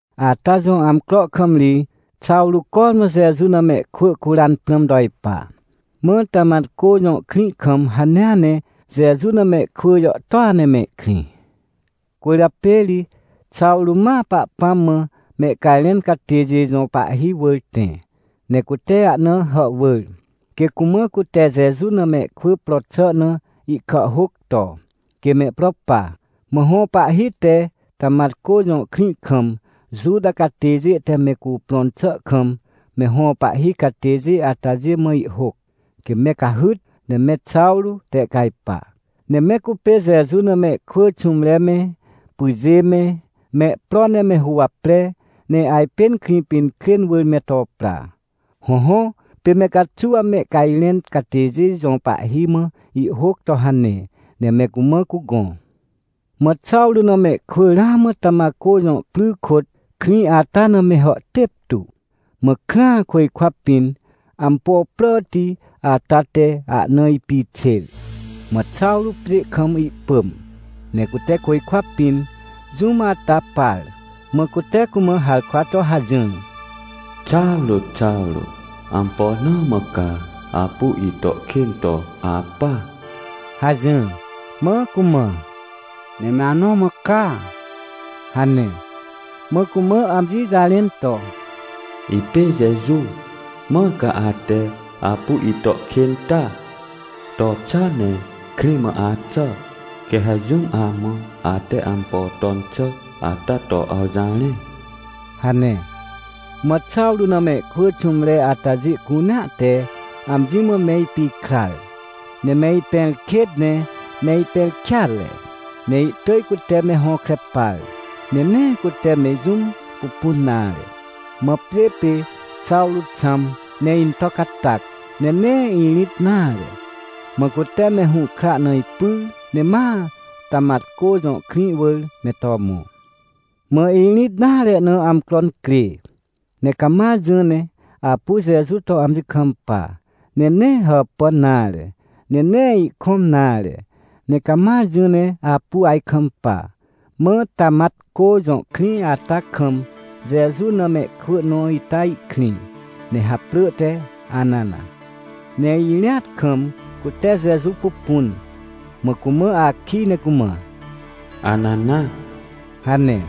Ata jõ amcro kam ri Xawrô cormã Jeju na mehkwỳ curan prãm to ipa. Mã Tamatcô jõ krĩ kam hanea ne Jeju na mehkwỳ jàhtôa ne mehkrĩ. Cwỳrjapê ri Xawrô ma Pahpãm mã mehcajrẽn catêjê jõ pahhi wỳr tẽ, ne cute ahna hàhwỳr, quê cumã cute Jeju na mehkwỳ pro xà na ihkàhhôc to, quê mehpro pa. Mã hõ pahhi te Tamatcô jõ krĩ kam Juta catêjê te me cuprõn xà kam me hõ pahhi catêjê atajê mã ihhôc, quê me cahyt, ne me Xawrô tehcajpa. Ne me cupê Jeju na mehkwỳ xũmre me, pyjê me, mehpro ne me huwapre, ne ajpên Krĩpinkrên wỳr me to pra. Hõhõ, pê me caxuw mehcajrẽn catêjê jõ pahhi mã ihhôc to hane, ne me cumã cugõ. Mã Xawrô na mehkwỳ ramã Tamatcô jõ pry kôt, krĩ ata na me hàhtêp tu, mã krã, côjkwa pĩn ampo pràti ata te ahna ipixêr. Mã Xawrô pjê kam ihpỳm, ne cute côjkwa pĩn jũm ata par, mã cute cumã harkwa to hajỹr: — Xawrô, Xawrô, ampo na mã ca apu ito kên to apa? — hajỹr. Mã cumã: — Me anõ mã ca? — hane. Mã cumã amji jarẽn to: — Ipê Jeju, mãr ca ate apu ito kên ata! To xa ne krĩ mã axà, quê ha jũm amã ate ampo ton xà ata to awjarẽ — hane. Mã Xawrô na mehkwỳ xũmre atajê cunea te amji mã me ipikrar, ne me ipẽrkêt ne me ipẽrkêatre. Ne ihtỳj cute me hõkre par, ne nee cute me jũm pupun nare. Mã pjê pê Xawrô xãm, ne into catac, ne nee irĩt nare. Mã cute me hũhkra na ipyr, ne ma Tamatcô jõ krĩ wỳr me to mõ. Mã irĩt nare na amcro incrê, ne cama jỹ ne apu Jeju to amji kampa, ne nee hàpàn nare, ne nee ihkõm nare, ne cama jỹ ne apu ajkampa. Mã Tamatcô jõ krĩ ata kam Jeju na mehkwỳ nõ ita ihkrĩ, ne haprỳ te Anana. Ne irĩat kam cute Jeju pupun, mã cumã akij ne cumã: — Anana — hane.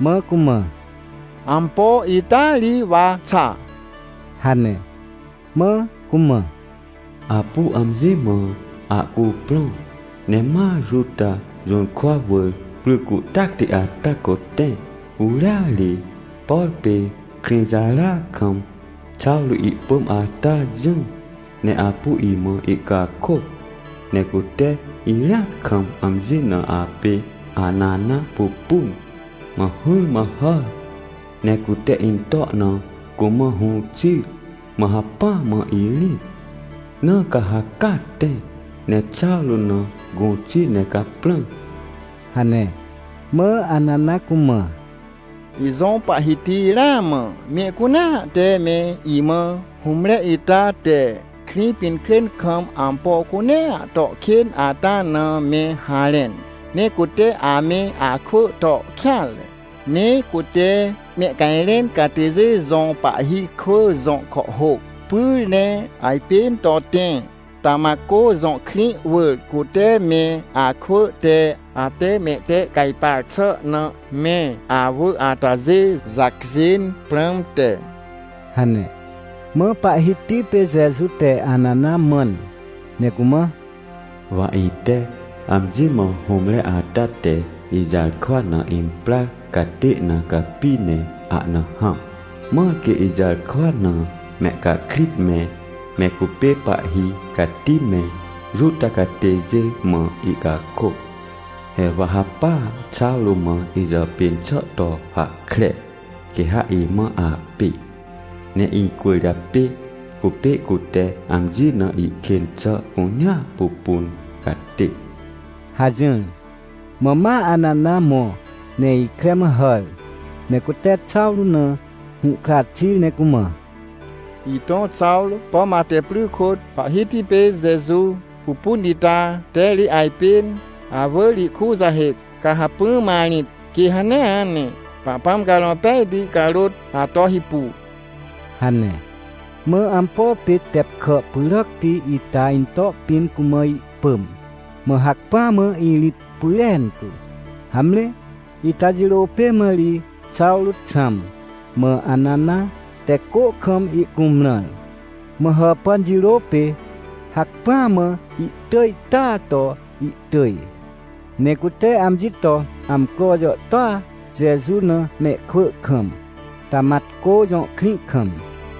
Mã cumã: — Ampo? Ita ri wa xa — hane. Mã cumã: — Apu amji mã ahcuprõ ne ma Juta jũrkwa wỳr pry cuhtacti ata kôt tẽ. Curia ri, por pê Krĩjara kam Xawrô ihpỳm ata jỹ, ne apu imã ihcakôc. Ne cute irĩat kam amji na apê Anana pupun, mã hỹrmã hàr ne cute into na cumã hũ xir, mã hacpỹa mã irĩt. Na ca ha caa tẽ, ne Xawrô na gũ xi ne caprã — hane. Mã Anana cumã: — Ijõ Pahhiti, ramã mehcunea te me imã hũmre ita te Krĩpinkrên kam ampo cunea to kên ata na me harẽn, ne cute ame akwỳ to kêanre. Ne cute mehcajrẽn catêjê jõ pahhi kwỳ jõ kàhhôc pyr, ne ajpên to tẽ, Tamatcô jõ krĩ wỳr, cute me akwỳ te, ate mehtehcajpar xà na me awỳr atajê jacjên prãmte — hane. Mã Pahhiti pê Jeju te Anana mãn, ne cumã: — Wa ite amji mã hũmre ata te ijarkwa na imprar catê na capi ne ahna hãm, mãr quê ijarkwa na mehcahkrit me, me cupê pahhi cati me, Juta catêjê mã ihcakôc. He wa ha pa Xawrô mã ijàpên xà to hahkre, quê ha imã apê. Ne icwỳrjapê cupê cute amji na ihkên xà cunea pupun catê — hajỹr. Mã ma Anana mõ ne ikre mã hàr, ne cute Xawrô na hũhkra xir ne cumã: — Itõ Xawrô, pom ate pry kôt Pahhiti pê Jeju pupun ita te ri ajpên awỳr ikujahêc, ca hacpỹa mã rĩt, quê hanea ne Pahpãm Carõ Pejti carôt ato hipu — hane. Mã ampo pê tep kà pyràcti ita into pĩn cumã ihpỳm, mã hacpỹa mã irĩt pyrentu. Hamre, ita jirô pê mã ri Xawrô xãm, mã Anana te cô kam ihcumrãr. Mã hàpàn jirô pê, hacpỹa mã ihtỳj taa to ihtỳj. Ne cute amji to amcro jàhtôa Jeju na mehkwỳ kam, Tamatcô jõ krĩ kam.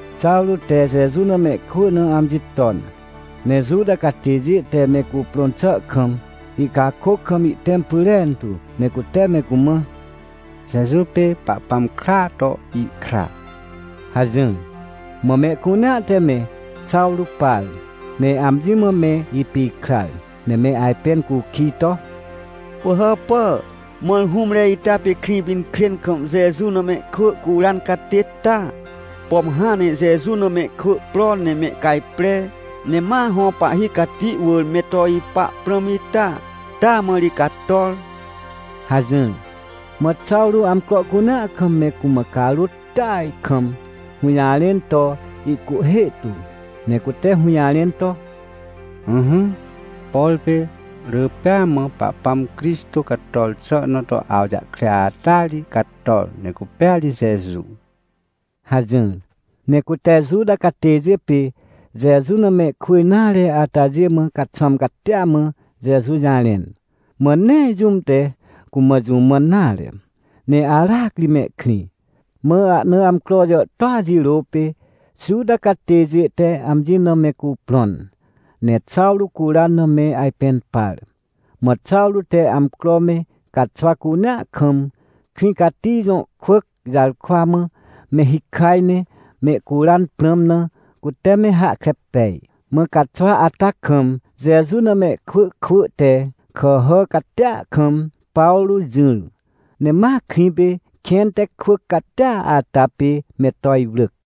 Xawrô te Jeju na mehkwỳ na amji ton, ne Juta catêjê te me cuprõn xà kam, ihcakôc kam ihtẽm pyrentu, ne cute me cumã: — Jeju pê Pahpãm kraa to ihkra — hajỹr. Mã mehcunea te me Xawrô par, ne amji mã me ipikrar, ne me ajpẽn cukij to: — Pỳhàpà, mãr hũmre ita pê Krĩpinkrên kam Jeju na mehkwỳ curan catê ta? Pom hãn ne Jeju na mehkwỳ pro ne mehcajpre, ne ma hõ pahhi cati wỳr me to ipa prãm ita? Taa mã ri cator — hajỹr. Mã Xawrô amcro cunea kam me cumã carôt tỳaj kam hũjarẽn to ihcuhhê tu. Ne cute hũjarẽn to: — Ỹhỹ, por pê rỳ pêa mã Pahpãm Crixtô cator xà na to awjahkre ataa ri cator, ne cupêa ri Jeju — hajỹr. Ne cute Juta catêjê pê Jeju na mehkwỳ nare atajê mã caxwãm catia mã Jeju jarẽn. Mã nee jũm te cumã jũ mãn nare, ne aracri mehkrĩ. Mã ahna amcro jàhtôa jirô pê Juta catêjê te amji na me cuprõn, ne Xawrô curan na me ajpẽn par. Mã Xawrô te amcro me caxwa cunea kam, krĩ cati jõ kwỳc jarkwa mã me hikaj ne mehcuran prãm na, cute me hahkre pej. Mã caxwa ata kam, Jeju na mehkwỳ kwỳ te kàhà catia kam Pawrô jỹr, ne ma krĩ pê, kẽn te kwỳc catia ata pê me to iwrỳc.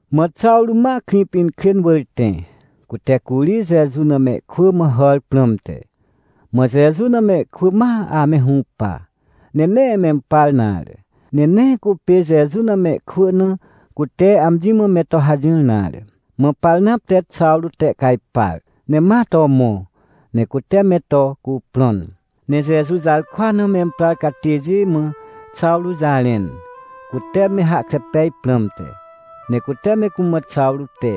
Mã Xawrô ma Krĩpinkrên wỳr tẽ, cute curi Jeju na mehkwỳ mã hàr prãmte. Mã Jeju na mehkwỳ ma ame hũpa. Ne nee mempar nare, ne nee cupê Jeju na mehkwỳ na, cute amji mã me to hajỹr nare. Mã Parnap te Xawrô tehcajpar, ne ma to mõ, ne cute me to cuprõn, ne Jeju jarkwa na memprar catêjê mã Xawrô jarẽn, cute me hahkre pej prãmte. Ne cute me cumã Xawrô te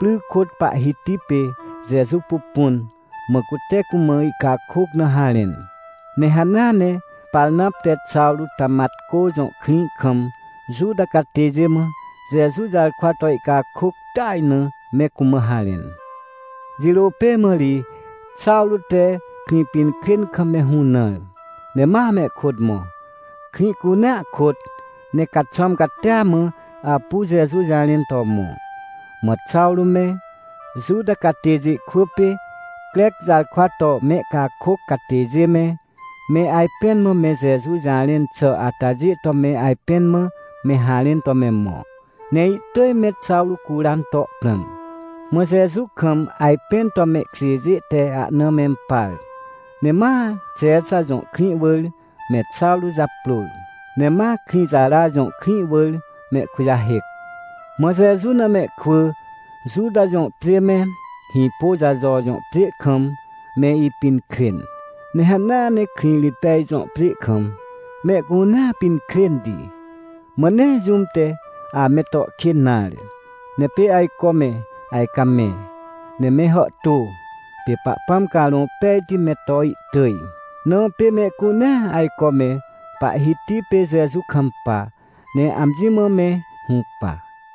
pry kôt Pahhiti pê Jeju pupun, mã cute cumã ihcakôc na harẽn. Ne hanea ne Parnap te Xawrô Tamatcô jõ krĩ kam Juta catêjê mã, Jeju jarkwa to ihcakôc tỳaj na me cumã harẽn. Jirô pê mã ri Xawrô te Krĩpinkrên kam me hũnãr, ne ma mehkôt mõ, krĩ cunea kôt, ne caxwãm catia mã apu Jeju jarẽn to mõ. Mã Xawrô me, Juta catêjê kwỳ pê Crec jarkwa to mehcakôc catêjê me, me ajpẽn mã me Jeju jarẽn xà atajê to me ajpẽn mã me harẽn to me mõ. Ne ihtỳj me Xawrô curan to prãm. Mã Jeju kam ajpẽn to mehkjêjê te ahna mempar, ne ma Xexa jõ krĩ wỳr me Xawrô japrôr. Ne ma Krĩjara jõ krĩ wỳr mehkujahêc. Mã Jeju na mehkwỳ, Juta jõ pjê me, Hĩpôjajo jõ pjê kam, me ipinkrên, ne hanea ne Krĩrĩtpej jõ pjê kam, mehcunea pinkrênti. Mã nee jũm te ame to kên nare. Ne pê ajco me ajcamẽ, ne me hàhtô, pê Pahpãm Carõ Pejti me to ihtỳj, na pê mehcunea ajco me Pahhiti pê Jeju kampa, ne amji mã me hũpa.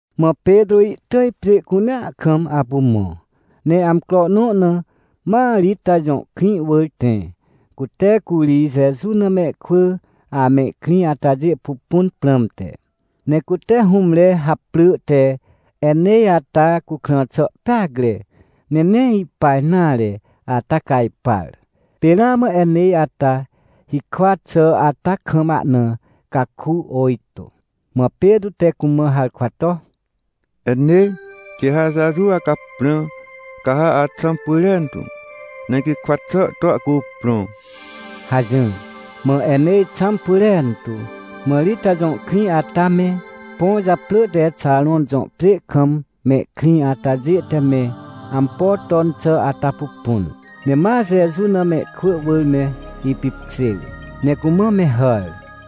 Mã Petrô ihtỳj pjê cunea kam apu mõ, ne amcro nõ na ma Rita jõ krĩ wỳr tẽ, cute curi Jeju na mehkwỳ amehkrĩ atajê pupun prãmte. Ne cute hũmre haprỳ te Enêj ata cukrã xà peacre, ne nee ipa nare ata cajpar. Pê ramã Enêj ata hikwa xà ata kam ahna caku ôjtô. Mã Petrô te cumã harkwa to: — Enêj, quê ha Jeju acaprã, ca ha axãm pyrentu, ne gikwa xà to ahcuprõ — hajỹr. Mã Enêj xãm pyrentu. Mã Rita jõ krĩ ata me, põ japrỳ te Xaron jõ pjê kam mehkrĩ atajê te me ampo ton xà ata pupun, ne ma Jeju na mehkwỳ wỳr me ipipkjêr, ne cumã me hàr.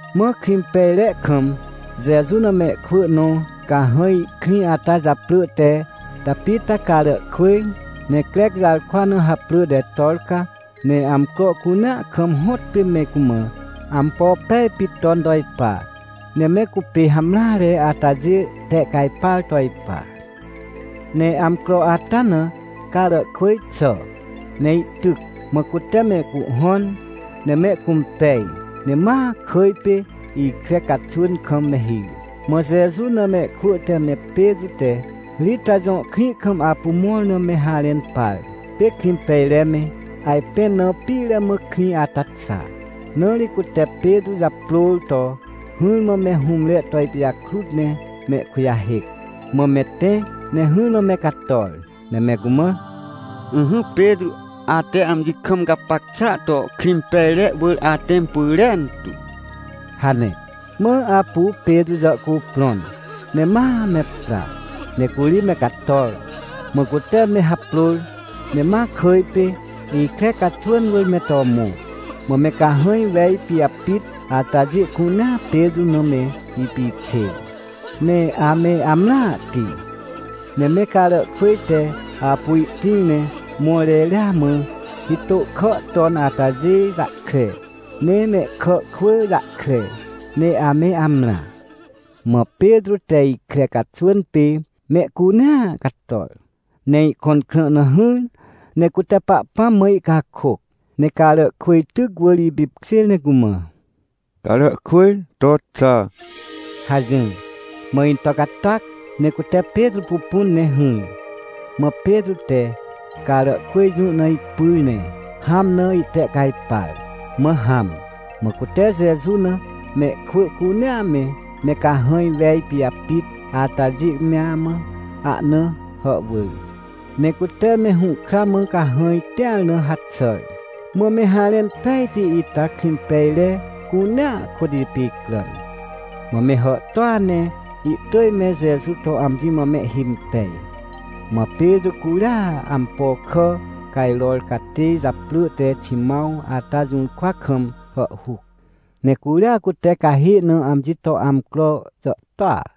Mã Krĩmpejre kam Jeju na mehkwỳ nõ cahãj ihkrĩ ata japrỳ te Tapita Caràhkwỳj, ne Crec jarkwa na haprỳ te Torca, ne amcro cunea kam hõtpê me cumã ampo pej pit ton to ipa, ne me cupê hamreare atajê tehcajpar to ipa. Ne amcro ata na Caràhkwỳj xà, ne ihtyc. Mã cute mehcuhhõn ne mehcũmpej, ne ma kỳj pê ikre caxwỳn kam me hir. Mã Jeju na mehkwỳ te me Petrô te Rita jõ krĩ kam apu mõr na me harẽn par. Pê Krĩmpejre me ajpẽn na pire mã krĩ ata xa, na ri cute Petrô japrôr to hỹrmã me hũmre to ipijakrut ne mehkujahêc. Mã me tẽ, ne hỹrmã me cator, ne me cumã: — Ỹhỹ Petrô, ate amji kam gapac xàa to Krĩmpejre wỳr atẽm pyrentu — hane. Mã apu Petrô jàhcuprõn, ne ma me pra. Ne curi me cator, mã cute me haprôr ne ma kỳj pê, ikre caxwỳn wỳr me to mõ. Mã me cahãj wej pijapit atajê cunea Petrô na me ipixêr, ne ame amrãhti. Ne me Caràhkwỳj te apu ihtĩr ne mõr reria mã, hitô kà ton atajê jahkre, ne mehkà kwỳ jahkre, ne ame amrã. Mã Petrô te ikre caxwỳn pê mehcunea cator, ne ihkõn krã na hỹr, ne cute Pahpãm mã ihcakôc, ne Caràhkwỳj tyc wỳr ipipkjêr ne cumã: — Caràhkwỳj, to xa — hajỹr. Mã into catac, ne cute Petrô pupun ne hỹr. Mã Petrô te Caràhkwỳj jũ na ipyr ne hãm na ihtehcajpar, mã hãm. Mã cute Jeju na mehkwỳ cunea me, me cahãj wej pijapit atajê mea mã ahna hàhwỳr, ne cute me hũhkra mã cahãj tĩar na haxàr. Mã me harẽn pejti ita Krĩmpejre cunea kôt ipicràn, mã me hàhtôa ne ihtỳj me Jeju to amji mã mehhimpej. Mã Petrô curia ampo kà cajror catê japrỳ te Ximãw ata jũrkwa kam hàhhuc, ne curia cute cahê na amji to amcro jàhtôa.